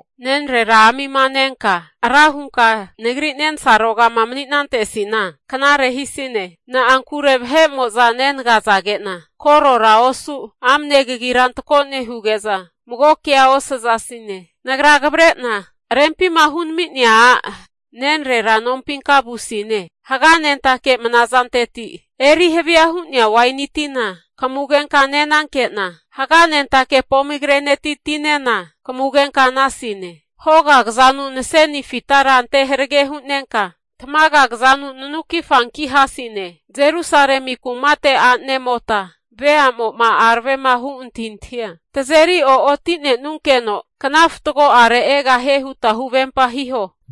Nenrera amima nenka ra hunka nagri nensarogama mani'nantesina, knare hisine. Na'ankure vahe'mo'za nenagazage'na korora osu, amne kagira antako nehuge'za mago kea osazasine. Nagra kavre'na rempima hunami'nea a' nenrera nompinka vusine. Haganentake mnazanteti eri havia hu'nea waini tina kamugenka nenanke'na, haganentake pomigreneti tinena kamugenka nasine. Hoga kazanu naseni fitara ante harage hunenka, tamaga kazanu nanuki fanki hasine. Jerusalemi kumate a'nemota veamo'ma aravema hu antahintahia tazeri o'otinenunkeno kna fatgo'are egahie huta huvempa hiho.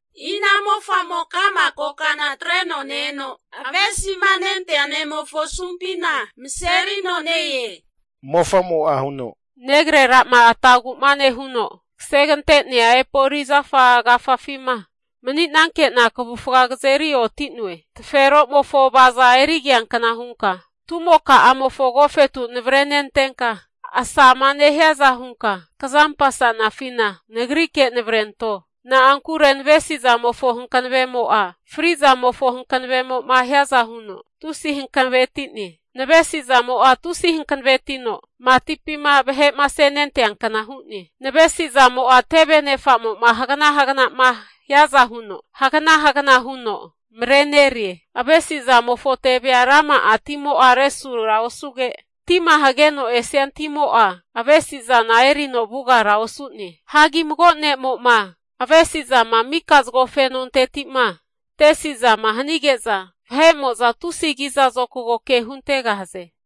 Ina mofamo ka'ma kokana atreno ne-eno, avesima nentea ne'mofo asumpina maserino ne-e? Mofamo'a huno, Negrera'ma atagu'ma nehuno kasegante'nea epoli zafa agafafima mani'nankena kavufga kazeri oti'noe. Taferomofo avaza'a erigiankna hunka, tumoka'amofo agofetu navrenentenka asama nehiaza hunka kazampasanafina nagrike navrento. Na'ankure navesizamofo hankanavemo'a frizamofo hankavemo'ma hiaza huno tusi hankanaveti'ne. Navesizamo'a tusi hankanavetino matipima vahe'ma asenenteankna hu'ne. Navesizamo'a teve anefamo'ma hagana hagana'ma hiaza huno hagana hagana huno marenerie. Avesizamofo tevea rama'a timo'a resura osuge, tima hageno esia timo'a avesizana erino vugara osu'ne. Hagi mago ne'mo'ma avesizama mika zago fenonteti'ma tesi'zama hanige'za, vahe'mo'za tusi kiza zokago ke huntegahaze.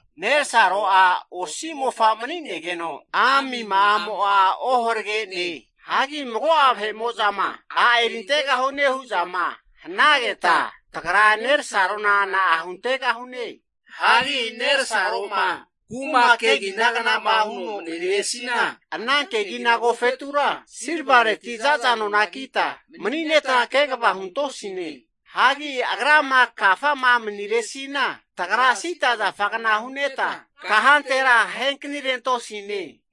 Nerasaro'a osi mofa mani'negeno, amima'amo'a oharage'ne. Hagi mago'a vahe'mo'zama a' erintegahune hu'zama hanageta, tagra nerasarona na'a huntegahune? Hagi nersaro'ma kuma keginagna'ma huno maniresina, ana kegina agofetura silvareti zaza nona kita manineta kegava huntosine. Hagi agrama kafama maniresina, tagra sida zafagna huneta, kahantera ahekanirentosine.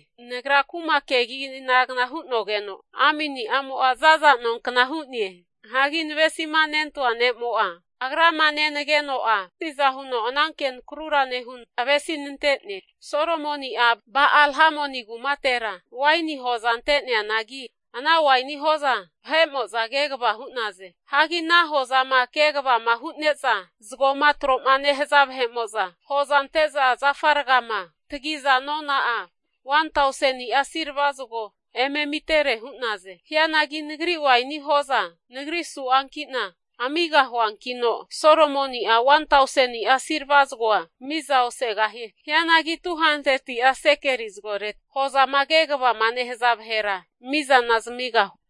Nagra kuma keginagna hu'nogeno, amini'amo'a za'za nonkna hu'ne. Hagi navesimanentoa ne'mo'a agrama nenageno'a tusiza huno ananke nakrura nehuno avesinante'ne. Solomoni'a Ba'al-hamoni kumatera waini hoza ante'neanagi, ana waini hoza vahe'mo'za kegava hu'naze. Hagi ana hozama kegavama hu'neza zagoma troma nehaza vahe'mo'za hozama ante'za zafa rgama tagiza nona'a 1tauseni'a silva zago eme amitere hu'naze. Hianagi nagri waini hoza nagri su'ankina amigahuankino, Solomoni'a 1tausenia silva zagoa miza osegahie. Hianagi 200'a sekeli zagoreti hozama kegavama nehaza vahera mizana zamigahue.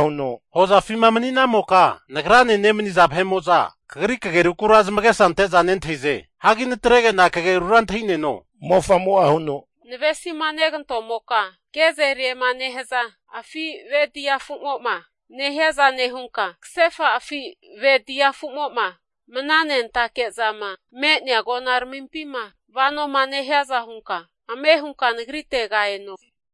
Hozafima mani'namoka, nagrane nemaniza vahe'mo'za kagri kagerukura zamagesa ante'za nentahize. Hagi natrege'na kagerura antahi'neno. Navesima negantomoka gezeriema nehaza afi ve dia afumo'ma nehiaza nehunka, kasefa afi ve dia afumo'ma mananentake zama me'nea agonaramimpima vanoma nehiaza hunka ame hunka nagritega eno.